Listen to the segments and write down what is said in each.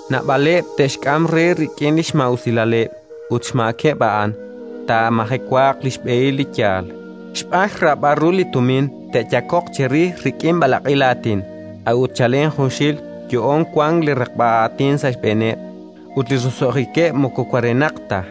Naab'aleb' te'xk'am re rik'in li xmaa'usilaleb' ut, xmaakeb' a'an, taamajewaaq li xb'ehil li yaal. Xb'aan xraab'al ru li tumin te'yakoq cherix rik'in b'alaq'il aatin; a'ut chalen junxil yo'oon wank li raqb'a aatin sa' xb'eeneb', ut li roso'jikeb' moko warenaq ta.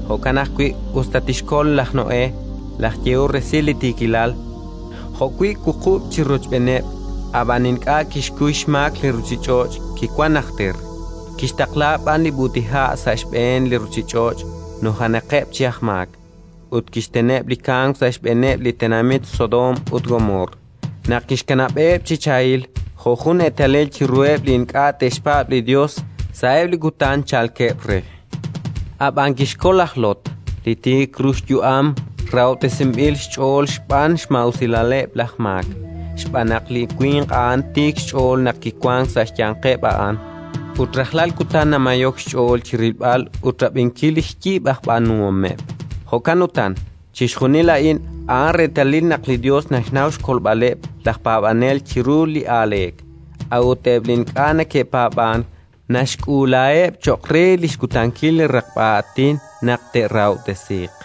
Jo'kan ajwi', us ta kixkol laj Noé, laj yehol resil li tiikilal, jo'wi' wuqub' chik rochb'eeneb', ab'an ink'a' kixkuy xmaak li ruuchich'och' kiwank najter; kixtaqla b'an li b'ut'iha' sa' xb'een li ruuchich'och' nujenaqeb' chi aj maak. Ut kixteneb' li kamk sa' xb'eeneb' li tenamit Sodoom ut Gomoor, naq kixkanab'eb' chi chahil, jo' jun eetalil chiruheb' li ink'a' te'xpaab' li Yos sa'eb' li kutan chalkeb' re. Ab'an kixkol laj Lot, li tiik ru xyu'am rahob'tesinb'il xch'ool xb'aan xmaa'usilaleb' laj maak, xb'aan naq li winq a'an tiik xch'ool naq kiwank sa' xyanqeb' a'an, ut rajlal kutan namayok xch'ool chi rilb'al ut rab'inkil li xyib' aj b'aanuhomeb'. Jo'kan utan, chixjunil a'in a'an reetalil naq li Yos naxnaw xkolb'aleb' laj paab'anel chiru li aaleek; a'ut eb' li ink'a' neke'paab'ank, naxk'uulaheb' cho'q re xkutankil li raqb'a aatin naq te'rahob'tesiiq: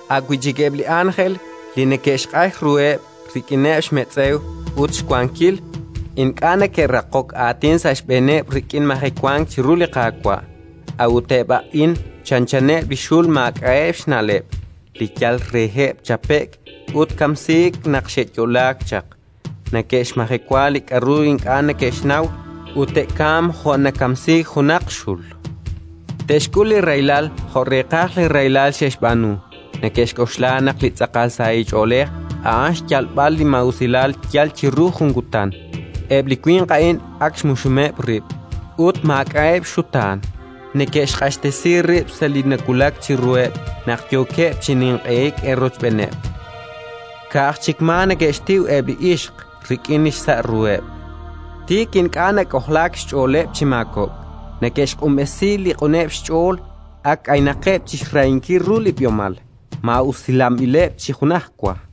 a' wi' chik eb' li ánjel li neke'xq'ax ruheb' rik'ineb' xmetz'ew ut xwankil, ink'a' neke'raqok aatin sa' xb'eeneb' rik'in majewank chiru li Qaawa'. A'ut eb' a'in chanchaneb' li xul maak'a'eb' xna'leb', li yal reheb' chape'k ut kamsiik naq xe'yo'laak chaq: neke'xmajewa li k'aru ink'a' neke'xnaw, ut te'kamq jo' nakamsiik junaq xul. Te'xk'ul li rahilal jo' reeqaj li rahilal xe'xb'aanu. Neke'xk'oxla naq li tz'aqal sahil ch'oolej a'an xyalb'al li maa'usilal yal chiru jun kutan. Eb' li winq a'in ak xmuxumeb' rib' ut maak'a'eb' xxutaan: neke'xq'axtesi rib' sa' li nawulak chiruheb' naq yookeb' chi ninq'ehik eerochb'eeneb'. Ka'aj chik maa neke'xtiw eb' li ixq rik'in xsa' ruheb', tik ink'a' nak'ojlaak xch'ooleb' chi maakob'k; neke'xq'unb'esi li q'uneb' xch'ool, ak k'aynaqeb' chi xrahinkil ru li b'ihomal, maa'usilanb'ileb' chi junajwa!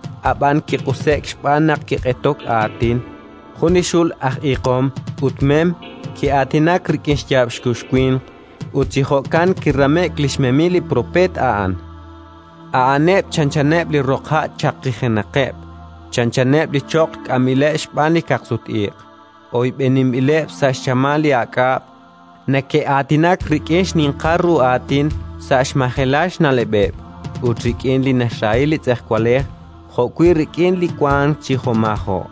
ab'an kiq'use'k xb'aan naq kiq'etok aatin: jun li xul aj iiqom ut mem ki'aatinak rik'in xyaab' xkux winq, ut chi jo'kan kirame'k li xmemil li propeet a'an. A'aneb' chanchaneb' li roqha' chaqijenaqeb', chanchaneb' li choql k'amb'ileb' xb'aan li kaqsut-iq': oyb'eninb'ileb' sa' xchamal li aak'ab'. Neke'aatinak rik'in xninqal ru aatin sa' xmajelal xna'leb'eb'; ut rik'in li naxrahi li tz'ejwalej jo'wi' rik'in li wank chi jo'maajo',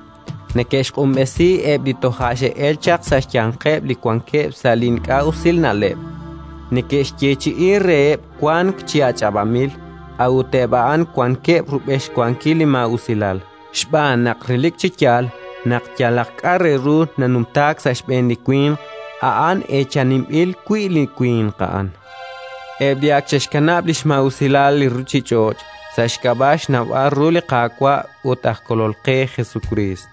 neke'xq'unb'esi eb' li toja' xe'elk chaq sa' xyanqeb' li wankeb' sa' li ink'a' usil na'leb'. Neke'xyeechi'i reheb' wank chi ach'ab'anb'il, a'ut eb' a'an wankeb' rub'el xwankil li maa'usilal, xb'aan naq relik chi yaal naq yalaq k'a' re ru nanumtaak sa' xb'een li winq, a'an eechaninb'il wi' li winq a'an. Eb' li ak xe'xkanab' li xmaa'usilal li ruuchich'och' sa' xk'ab'a' xnawb'al ru li Qaawa' ut aj Kolol qe Jesukriist,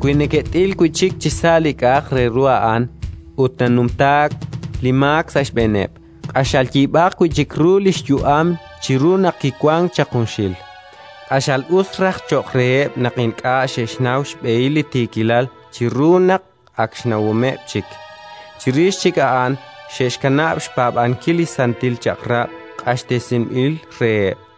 wi neke't'il wi' chik chisa' li k'a'aq re ru a'an ut nanumtaak li maak sa' xb'eeneb', q'axal yib'aq wi' chik ru li xyu'am chiru naq kiwank chaq junxil. Q'axal us raj cho'q reheb' naq ink'a' xe'xnaw xb'ehil li tiikilal chiru naq, ak xnawomeb' chik, chirix chik a'an xe'xkanab' xpaab'ankil li Santil Chaq'rab' q'axtesinb'il reheb'.